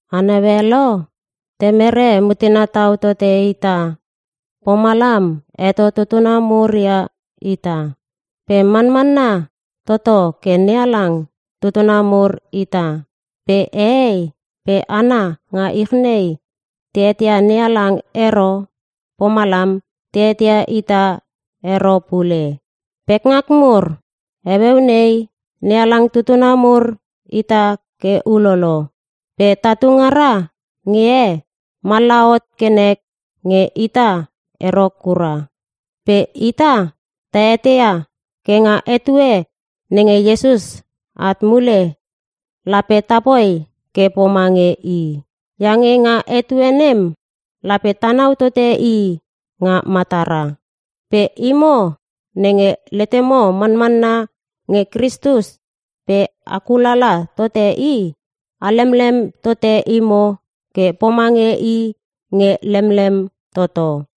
A naue lo! Temere mutena tau tote ita, pomalam heto tutuna mur ia ita. Pe manmanna toto ke NeHalang tutuna mur ita! Pe hehei pe hana nga ich nei te eteia NeHalang ero, pomalam te eteia ita ero pule. Pekngak mur, heueu nei NeHalang tutuna mur ita ke ulolo. Pe tatu ngara nge he, mallaha hot ke nek nge ita ero kura. Pe ita ta eteia ke nga etue nenge Iesus at mule, lape tapoi ke pomange I. Iange nga etue nem lape tanau tote I nga matara. Pe imo nenge letemo manmanna nge Kristus pe a kulala tote I, a helemlem tote imo ke pomange I nge lemlem toto.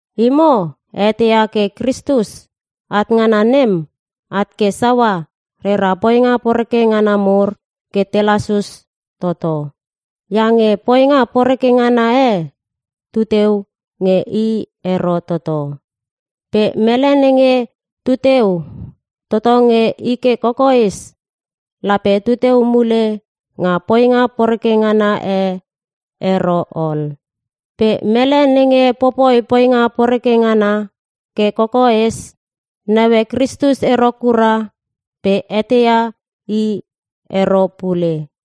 Imo a eteia ke Kristus at ngana nem, at ke saua rera poinga poreke ngana mur ke te lasus toto. Iange poinga poreke ngana e tu teu nge I ero toto. Pe mele nenge tu teu toto nge I ke kokoes lape tu teu mule nga poinga poreke ngana e ero ol. Pe mele nenge popoi poinga poreke ngana ke kokoes, naue Kristus ero kura pe eteia I ero pule.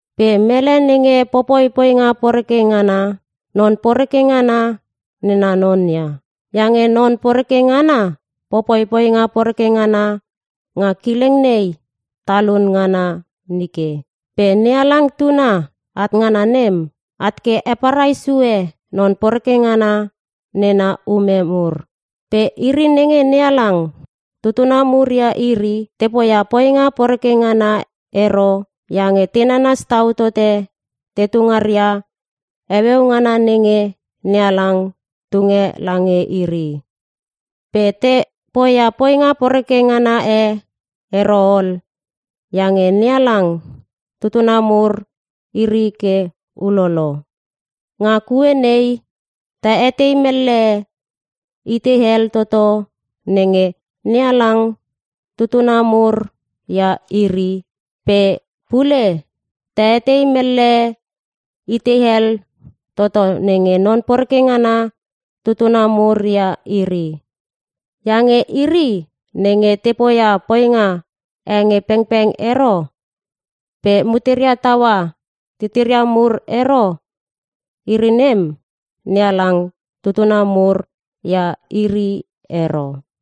Pe mele nenge popoi poinga poreke ngana, non poreke ngana nena non ia. Iange non poreke ngana popoi poinga poreke ngana nga kileng nei talun ngana nike. Pe NeHalang Tuna at ngana nem, at ke heparai sue non poreke ngana nena ume mur. Pe iri nenge NeHalang tutuna mur ia iri, te poia poinga poreke ngana ero iange te nanas tau tote tetu ngaria heueu ngana nenge NeHalang tunge lange iri. Pe te poia poinga poreke ngana e ero ol iange NeHalang tutuna mur iri ke ulolo. Nga kue nei ta etei mellehe itei hel toto nenge NeHalang tutuna mur ia iri, pe pule ta etei mellehe itei hel toto nenge non poreke ngana tutuna mur ia iri. Iange iri nenge te poia poinga e nge pengpeng ero pe muteria taua titiria mur ero, iri nem NeHalang tutuna mur ia iri ero.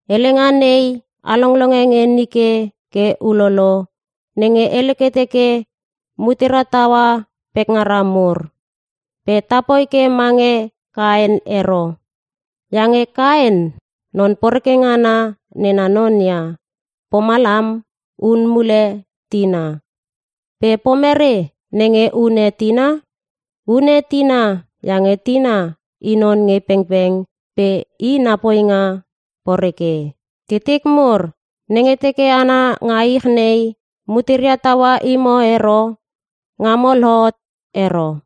Helenga nei a longlonge nge nike ke ulolo nenge hele ke teke, “Mutera taua pekngara mur.” Pe tapoi ke mange Kaen ero. Iange Kaen, non poreke ngana nena non ia, pomalam hun mule tina. Pe pomere nenge hune tina? Hune tina iange tina i non nge pengpeng pe i na poinga poreke. Titik mur, nenge teke hana nga ich nei muteria taua imo ero, ngamo lohot ero.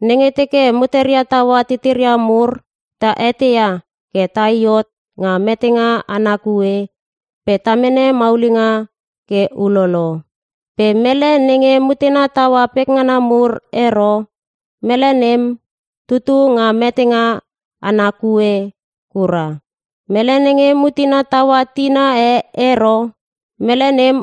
Nenge teke mutera taua titira mur, ta eteia ke tai hot nga metenga ana kue pe ta mene maulinga ke ulolo. Pe mele nenge mutena taua pekngana mur ero, mele nem tutu nga metenga ana kue kura. Mele nenge mutena taua tina e ero, mele nem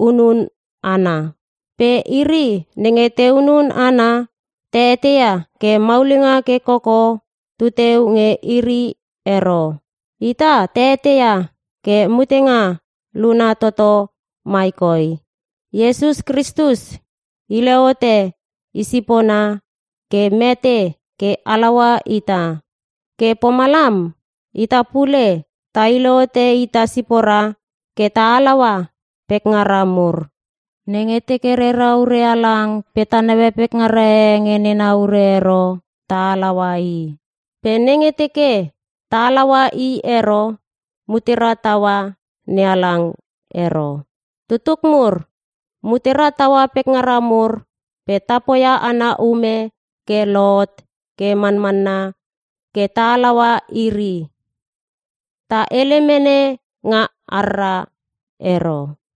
hunun hana. Pe iri nenge te hunun hana, ta eteia ke maulinga ke koko tuteu nge iri ero. Ita ta eteia ke mutenga luna toto mai koi: Iesus Kristus hile hote I sipona ke mete ke halaua ita. Ke pomalam ita pule ta hile hote ita sipora ke ta halaua pekngara mur. Nenge teke rera ure halang pe ta naue pekngara e nge nena ure ero ta halaua i. Pe nenge teke ta halaua i ero mutera taua NeHalang ero. Tutuk mur, mutera taua pekngara mur pe ta poia ana ume ke lohot ke manmanna ke ta halaua iri. Ta hele mene nga harra ero.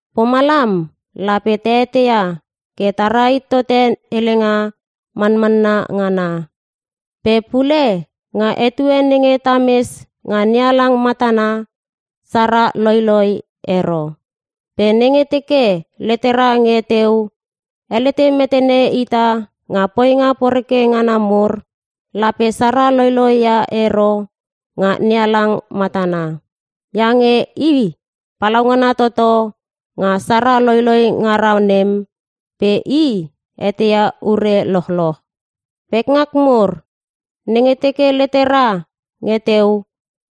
Pomalam lape ta eteia ke ta rahit tote helenga manmanna ngana. Pe pule, nga etue nenge tames nga NeHalang matana sara loiloi ero. Pe nenge teke letera nge teu helete metene ita nga poinga poreke ngana mur, lape sara loiloi ia ero nga NeHalang matana. Iange I palaungana toto nga sara loiloi ngara nem pe I eteia ure lochloch. Pekngak mur, nenge teke letera nge teu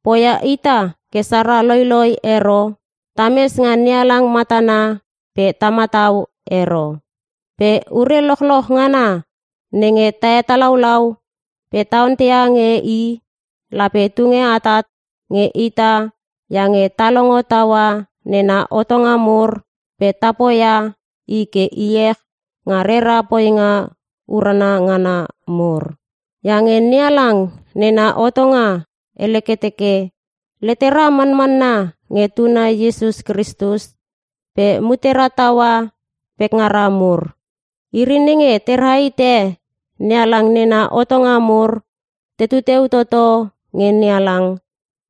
poia ita ke sara loiloi ero, tames nga NeHalang matana pe ta matau ero. Pe ure lochloch ngana nenge ta hetalaulau pe ta onteia nge I, lape tunge atat nge ita iange ta longo taua nena hotonga mur pe ta poia I ke iech nga rera poinga urana ngana mur. Iange NeHalang nena hotonga hele ke teke: “Letera manmanna nge Tuna Iesus Kristus pe mutera taua pekngara mur.” Iri nenge te rahite NeHalang nena hotonga mur tetu teu toto nge NeHalang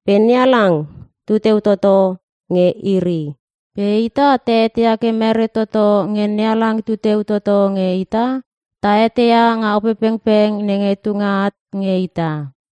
pe NeHalang tu teu toto nge iri. Pe ita ta eteia ke mere toto nge NeHalang tu teu toto nge ita? Ta eteia nga Opepengpeng nenge tunge at nge ita.